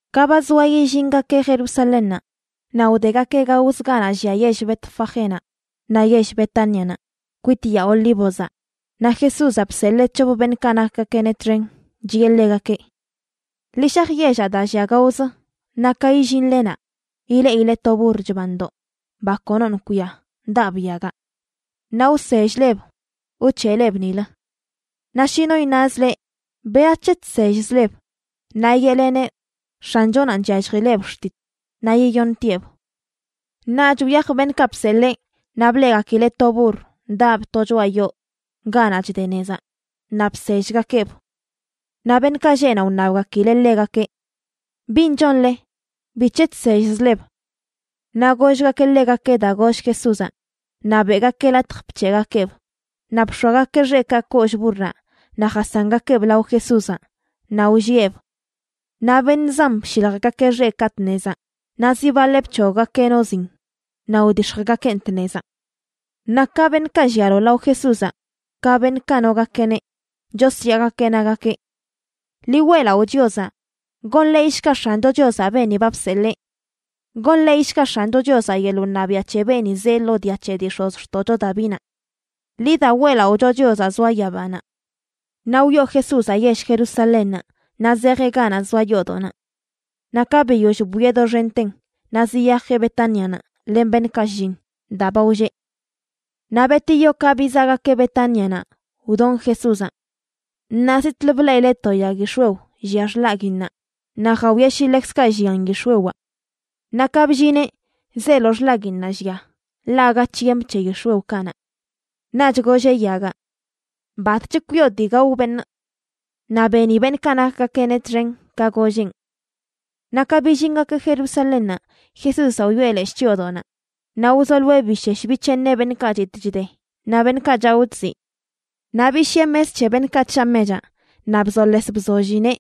Ka ba zoa yillingakeꞌ Jerusalénnaꞌ, naꞌ wdegakeꞌ gaozə ganaꞌ llia yell Betfagénaꞌ naꞌ yell Betánianaꞌ, kwit Yaa Olívozaꞌ, naꞌ Jesúzaꞌ bseḻee c̱hop beṉꞌkaꞌ nakgakeꞌneꞌ txen, chiꞌe ḻegakeꞌ: ―Ḻi shaj yellaꞌ daa llia gaozə, naꞌ ka illinle naꞌ, ileꞌile to burr chbandoꞌ, ba konoṉꞌ kwia, daꞌb yagaꞌ. Naꞌ wsell-leb wc̱heꞌleb nilə. Naꞌ shi no iṉaz leꞌ: “¿Berac̱he chsellzleb?”, naꞌ yeꞌleneꞌ: “X̱anchonanꞌ chyalljileꞌb xtit, naꞌ yiyoṉtieꞌb.” Naꞌch wyaj beṉꞌkaꞌ bseḻee, naꞌ bleꞌgakileꞌ to burr daꞌb to choꞌa yoo ganaꞌ chde nezaꞌ, naꞌ bsellgakeꞌb. Naꞌ beṉꞌkaꞌ lleꞌ naꞌ wṉabgakileꞌ ḻegakeꞌ: ―¿Bin chonle? ¿Bic̱he chsellzleb? Naꞌ gollgakeꞌ ḻegakeꞌ daa goll Jesúzaꞌ, naꞌ beꞌgakeꞌ latj bc̱heꞌgakeꞌb. Naꞌ bx̱oagakeꞌ xeꞌkaꞌ kollꞌ burraꞌ naꞌ jasangakeꞌb lao Jesúzaꞌ, naꞌ wllieꞌb. Naꞌ beṉꞌ zan bshiljgakeꞌ xeꞌkaꞌ tnezaꞌ, naꞌ zi baḻeꞌ bc̱hoggakeꞌ no zin naꞌ wdix̱jgakeꞌn tnezaꞌ. Naꞌ ka beṉꞌkaꞌ llialo lao Jesúzaꞌ ka beṉꞌkaꞌ nogakeꞌneꞌ, chosyaagakeꞌ, nagakeꞌ: ―¡Ḻi weꞌlaꞌo Chiozaꞌ! ¡Gonḻeeyshga X̱ancho Chiozaꞌ beeni ba bseḻee! ¡Gonḻeeyshga X̱ancho Chiozaꞌ yeḻꞌ wṉabiaꞌ c̱he beeni zee lo dia c̱he dii x̱ozxtoꞌcho Davinaꞌ! ¡Ḻi da weꞌlaꞌocho Chiozaꞌ zoa yabanaꞌ! Naꞌ wyoo Jesúzaꞌ yell Jerusalénnaꞌ naꞌ zejeꞌ ganaꞌ zoa yoodoꞌnaꞌ. Naꞌ ka biyoll bwieꞌ doxenten naꞌ ziyajeꞌ Betánianaꞌ len beṉꞌkaꞌ shlliṉ, daa ba wlleꞌ. Naꞌ betiyo ka bizaꞌgakeꞌ Betánianaꞌ, wdon Jesúzaꞌ. Naꞌ zitꞌlə bleꞌile to yag yix̱wew llia xḻaguinnaꞌ, naꞌ jawieꞌ shi ḻekzkaꞌ llian yix̱wewaꞌ. Naꞌ ka bllineꞌ zeelo xḻaguiinnaꞌ llia, ḻaꞌ aga tiemp c̱he yix̱wew kanaꞌ. Naꞌch golleꞌ yagaꞌ: ―¡Batch kwioꞌ dii gao beṉꞌ! Naꞌ beni beṉꞌkaꞌ nakgakeꞌneꞌ txen ka golleꞌn. Naꞌ ka billingakeꞌ Jerusalénnaꞌ, Jesúzaꞌ wyoꞌe leshꞌ chyoodoꞌnaꞌ naꞌ wzoloeꞌ bishesh bic̱heeṉeꞌ beṉꞌkaꞌ chitꞌ chde naꞌ beṉꞌkaꞌ chaꞌo chziꞌ. Naꞌ bishiꞌe mes c̱he beṉꞌkaꞌ chshaa mechaꞌ naꞌ bzoles bzollineꞌ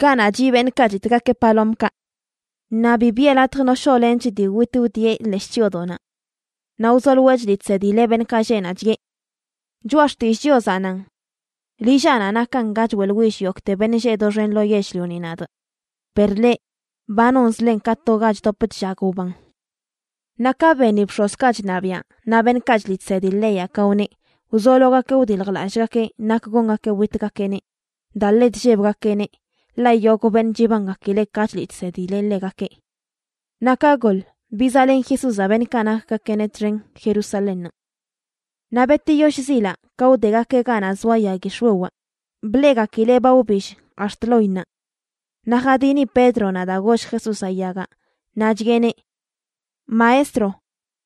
ganaꞌ chiꞌ beṉꞌkaꞌ chitꞌgakeꞌ palomkaꞌ. Naꞌ bi biꞌe latj no shoꞌlench dii witꞌ wdieꞌ leshꞌ chyoodoꞌnaꞌ. Naꞌ wzoloeꞌ chliꞌ chsedileꞌ beṉꞌkaꞌ lleꞌ naꞌ, chiꞌe: ―Choꞌa Xtillꞌ Chiozaꞌ nan: “Lillaꞌnaꞌ nakan ga choeꞌḻwill yogꞌte beṉꞌ lleꞌ doxen lo yell-lioni nadꞌ”, per leꞌ, ba nonzlen ka to ga chdop chllag wban. Naꞌ ka beni bx̱ozkaꞌ chṉabiaꞌ naꞌ beṉꞌkaꞌ chliꞌ chsedi leyaꞌ ka wneꞌ, wzologakeꞌ wdiljlallꞌgakeꞌ nak gongakeꞌ witgakeꞌneꞌ, daa ḻe chllebgakeꞌneꞌ, ḻaꞌ yogꞌ beṉꞌ chibangakileꞌ ka chliꞌ chsedileꞌ ḻegakeꞌ. Naꞌ ka goḻ, bizaꞌlen Jesúzaꞌ beṉꞌkaꞌ nakgakeꞌneꞌ txen Jerusalénnaꞌ. Naꞌ betiyo shzilaꞌ ka wdegakeꞌ ganaꞌ zoa yag yix̱wewaꞌ, bleꞌgakileꞌ ba wbill ax̱t loinnaꞌ. Naꞌ jadini Pédronaꞌ daa goll Jesúzaꞌ yagaꞌ naꞌ chiꞌeneꞌ: ―Maestro,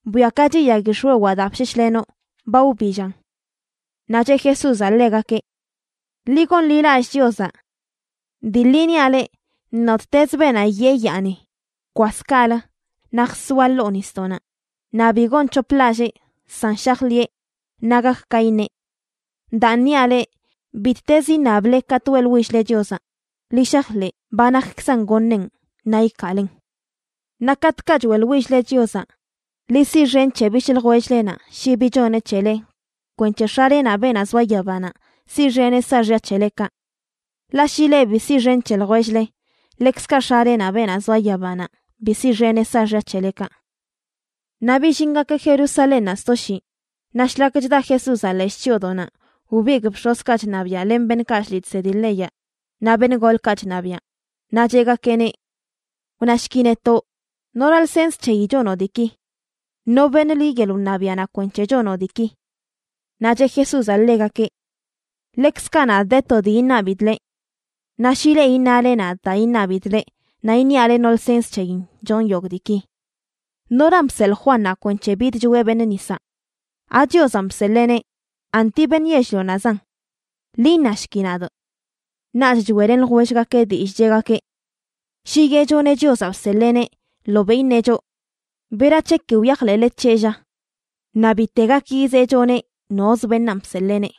bwiakachi, yag yix̱wewaꞌ daa bsheshlenoꞌ. Ba wbillan. Naꞌ cheꞌ Jesúzaꞌ ḻegakeꞌ: ―Ḻi gonḻilallꞌ Chiozaꞌ. Dii ḻi niaꞌ le, nottezə beenaꞌ yee yaani: “Bkwas kaꞌlə naꞌ jsoa ḻoo nisdoꞌnaꞌ”, naꞌ bi gonc̱hoplallee, san shajḻiꞌe, naꞌ gak ka iṉeꞌ. Daan niaꞌ leꞌ, bittezə iṉable katꞌ weꞌḻwill-le Chiozaꞌ, ḻi shajḻeꞌ ba nakkzan goṉeꞌn, naꞌ ikaalen. Naꞌ katꞌkaꞌ choeꞌḻwill-le Chiozaꞌ, ḻi siꞌxen c̱he bishꞌ ljwell-lenaꞌ shi bi choneꞌ c̱hele kwenc̱he X̱alenaꞌ beenaꞌ zoa yabanaꞌ siꞌxeneꞌ saaxya c̱helekaꞌ. Ḻaꞌ shi leꞌ bi siꞌxen c̱he ljwell-le, ḻekzkaꞌ X̱alenaꞌ, beenaꞌ zoa yabanaꞌ, bi siꞌxeneꞌ saaxya c̱helekaꞌ. Naꞌ billingakeꞌ Jerusalénnaꞌ sto shii, naꞌ shlak chda Jesúzaꞌ leshꞌ chyoodoꞌnaꞌ, wbigꞌ bx̱ozkaꞌ chṉabiaꞌ, len beṉꞌkaꞌ chliꞌ chsedi leyaꞌ naꞌ beṉꞌ golkaꞌ chṉabiaꞌ, naꞌ cheꞌgakeꞌneꞌ: ―Wnashki netoꞌ, ¿nora lsens c̱heyi chonoꞌ diiki? ¿No beṉ liꞌ yeḻꞌ wṉabiaꞌnaꞌ kwenc̱he chonoꞌ diiki? Naꞌ cheꞌ Jesúzaꞌ ḻegakeꞌ: ―Ḻekzkaꞌ nadꞌ, de to dii iṉabidꞌ leꞌ. Naꞌ shi leꞌ iṉale nadꞌ daa iṉabidꞌ leꞌ, naꞌ iṉiaꞌ leꞌ no lsens c̱heyin chonꞌ yogꞌ diiki. ¿Noran bseḻꞌ Juannaꞌ kwenc̱he bidchoeꞌ beṉꞌ nisaꞌ? ¿AChiozanꞌ bseḻeeneꞌ, anti beṉꞌ yell-lionaꞌzan? Ḻi iṉashki nadꞌ. Naꞌch choeꞌlen ljwellgakeꞌ dillꞌ, cheꞌgakeꞌ: ―Shi yeꞌchoneꞌ Chiozaꞌ bseḻeeneꞌ, ḻobeꞌ iṉeꞌ choꞌ: “¿Berac̱he ki wyajḻeꞌle c̱heꞌ, lla?” Naꞌ bite gak yizeꞌchoneꞌ nozə beṉaan bseḻeeneꞌ.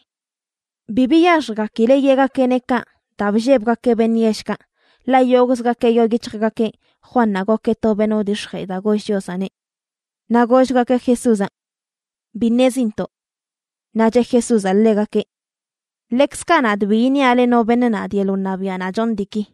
Bi biyaxjgakileꞌ yeꞌgakeꞌneꞌ kaꞌ daa bllebgakeꞌ beṉꞌ yellkaꞌ, ḻaꞌ yogꞌzgakeꞌ yoo yic̱hjgakeꞌ Juannaꞌ gokeꞌ to beṉꞌ wdix̱jee daa goll Chiozaꞌneꞌ. Naꞌ gollgakeꞌ Jesúzaꞌ: ―Bi ṉezintoꞌ. Naꞌ cheꞌ Jesúzaꞌ ḻegakeꞌ: ―Ḻekzkaꞌ nadꞌ, bi iṉiaꞌ leꞌ no beṉ nadꞌ yeḻꞌ wṉabiaꞌnaꞌ chonꞌ diiki.